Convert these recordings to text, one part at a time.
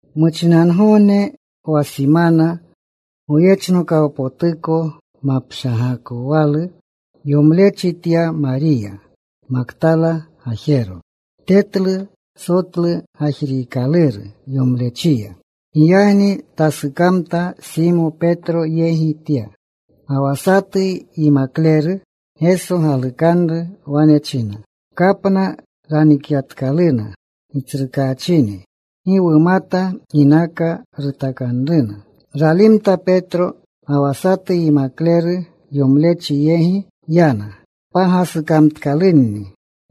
Muchinangogne wa simana, goyechnokawpotuko mapshagakowalu yomlechi tya Mariya Maktala gajero. Tetlu sotlu gajriikaluru yomlechiya. Giyagni tasukamta. Simo Petro yegi tya, ga wa satu yimakleru Geso galukanru. Wane chinna, “Kapna ranikyatkaluna Gitsrukaachini. Gi wumata ginaka rutakanruna.” Ralimta Petro ga wa satu yimakleru. Yomlechi yegi yana. Pagasukamtkalunni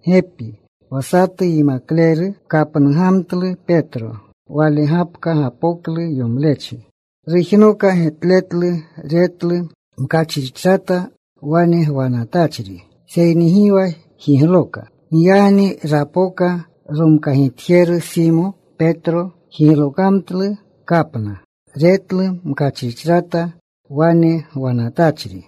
gepi. Wa satu yimakleru kapnugamtlu Petro. Wale gapka gapoklu yomlechi. Rujnoka getletlu. Retlu mkachrichrata wane gwanatachri. Seyni gi wa jigloka. Giyagni rapoka romkagitjeru, Simo Petro. Jiglokamtlu kapna. Retlu mkachrichrata wane gwanatachri.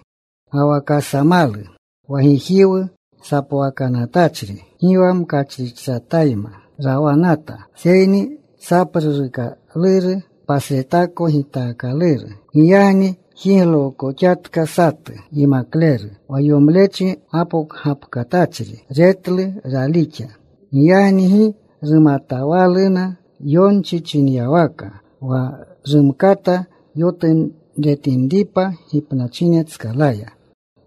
Ga wa kasamalu wa gijiwu sapwakanatachri gi wa mkachrichratayma rawanata, seyni sapruruukaluru pasretako gitaakaluru. Giyagni jiglookoxatka satu yimakleru wa yomlechi gapokgapkatachri. Retlu. Ralixa. Giyagni gi rumatawaluna yonchi chinyawaka, wa rumkata yotunretinripa gipnachinetskalaya.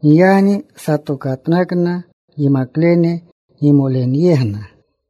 Giyagni satokatnakna yimaklene gimolenyegna.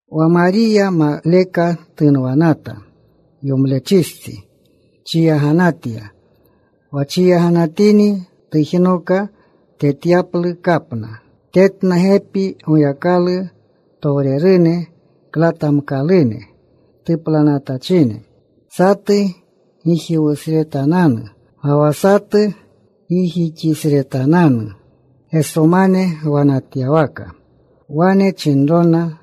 Wa Mariya maleka tunwanata. Yomlechistsi chiyaganatya. Wa chiyaganatini tujnoka tetyaplu kapna. Tetna gepi Goyakalutowrene klatamkalune tuplanatachine, satu gijiwusretananu, ga wa satu gijixisretananu Gesomane gwanatyawaka. Wane chinrona,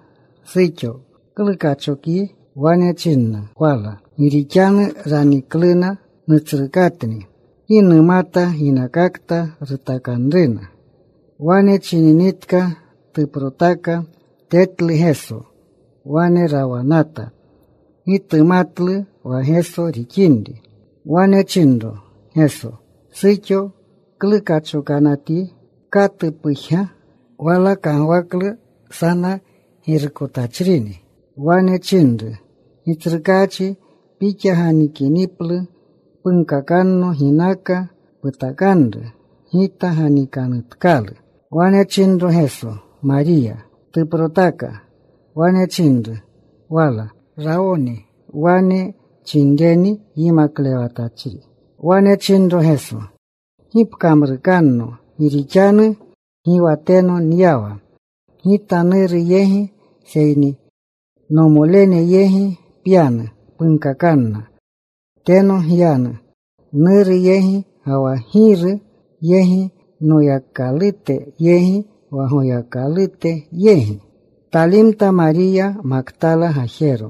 “Suxo, ¿klu kachokyi?” Wane chinna wala, “Gi rixanu ranikluna Nutsrukatni. Gi numata ginakakta rutakanruna.” Wane chininitka tuprotaka. Tetlu Geso. Wane rawanata. Gi tumatlu wa Geso rixinri. Wane chinro Geso, “¿Suxo, klu kachokanatyi? ¿Katu pujga?” Wala kagwaklu sana girukotachrini. Wane chinru, “Gitsrukaachi, Pixa ganikiniplu punkakanno ginaka putakniri. Gita ganikanutkalu.” Wane chinro Geso, “¡Mariya!” Tuprotaka. Wane chinru wala, “¡Rawoni!” Wane chinreni, “Yimaklewatachri.” Wane chinro Geso, “Gi pkamrukanno, gi rixanu gi wa teno nyawa Gita, Nuru yegi. Seyni nomolene yegi pyanu. Punkakanna, ‘Teno nyanu Nuru yegi ga wa Giru yegi, Noyakalute yegi, wa Goyakalute yegi.’” Talimta Mariya Maktala gajero.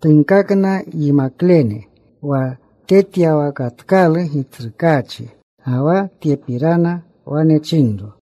Tunkakna yimaklene wa tetyawakatkalu Gitsrukaachi, ga wa tyepirana wane chinro.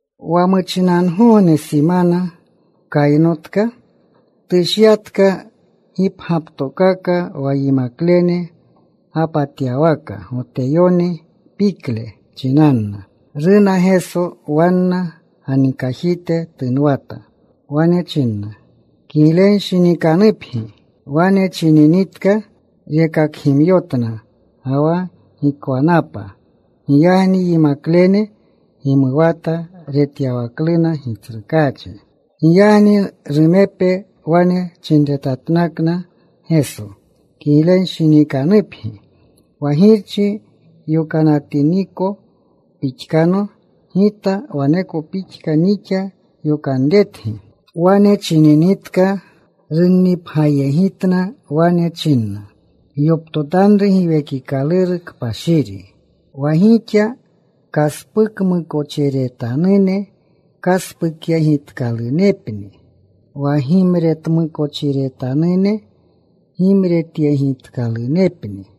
Wa muchinangogne simana kaynotka, tushyatka gipgyaptokaka wa yimaklene gapatyawaka Goteyone pikle chinanna, runa Geso. Wanna ganikajite tunwata. Wane chinna, “Kiglenshinikanupgi.” Wane chininitka rekakgimyotna ga wa gikwanapa. Giyagni yimaklene gimuwata retyawakluna Gitsrukaachi. Giyagni rumepe wane chinretatnakna Geso, “Kiglenshinikanupgi. Wa Girchi yokanatiniko pixkano Gita, waneko pixka nixa yokanretgi.” Wane chininitka, runnipgyayegitna. Wane chinna, “Gyoptotanru Giwekikaluru Kpashiri. Wa gixa kaspukmukochiretanune, kaspukyegitkalunepni. Wa gimretmukochiretanune gimretyegitkalunepni.”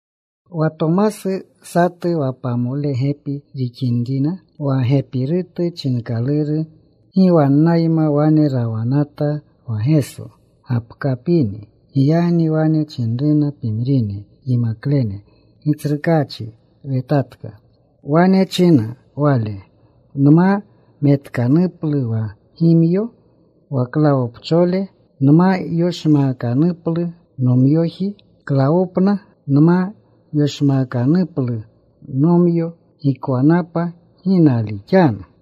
Wa Tomasu, satu wa pamole gepi rixinrina, wa Gepirutu chinkaluru, gi wannayma wane rawanata wa Geso gapkapini. Giyagni wane chinruna pimrine yimaklene, “Gitsrukaachi wetatka.” Wane chinna wale, “Nma metkanuplu wa gimyo wa klawopchole, nma yoshmaakanuplu nomyoji klawopna, nma yoshmaakanuplu nomyo gikwanapa, gi nalixanu.”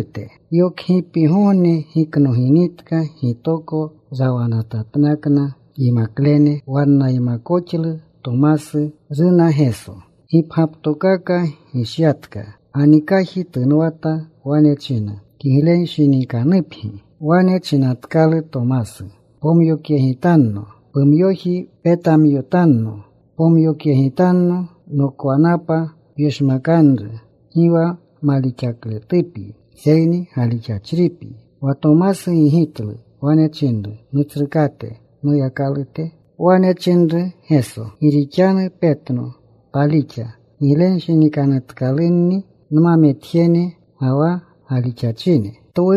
Yokgipgogne giknoginitka, gitoko rawanatatnakna yimaklene. Wannaymakoxlu Tomasu. Runa Geso. Gipgyaptokaka gishyatka. Ganikaji tunwata. Wane china, “Kiglenshinikanupgi.” Wane chinatkalu Tomasu, “Pomyokyegitanno pumyoji. Petamyotanno. Pomyokyegitanno. Nokwanapa pyoshmakanru. Gi wa malixakletupyi, seyni galixachripyi.” Wa Tomasu gigitlu. Wane chinru, “¡Nutsrukate! ¡Noyakalute!” Wane chinru Geso, “Gi rixanu petno, palixa. Giglenshinikanutkalunni nmametjene ga wa galixachine.”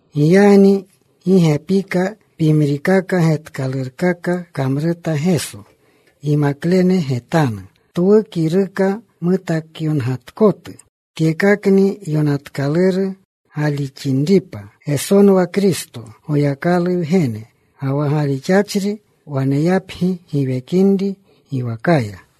Giyagni gi gepi pimrikaka getkalurkaka kamruta Geso, yimaklene getanu, twu kiruka mutakyongatkotu. Tyekakni yonatkaluru galixinripa Gesonwa Kristo Goyakalu Wgene, ga wa galixinri waneyapgi giwekinri giwakaya.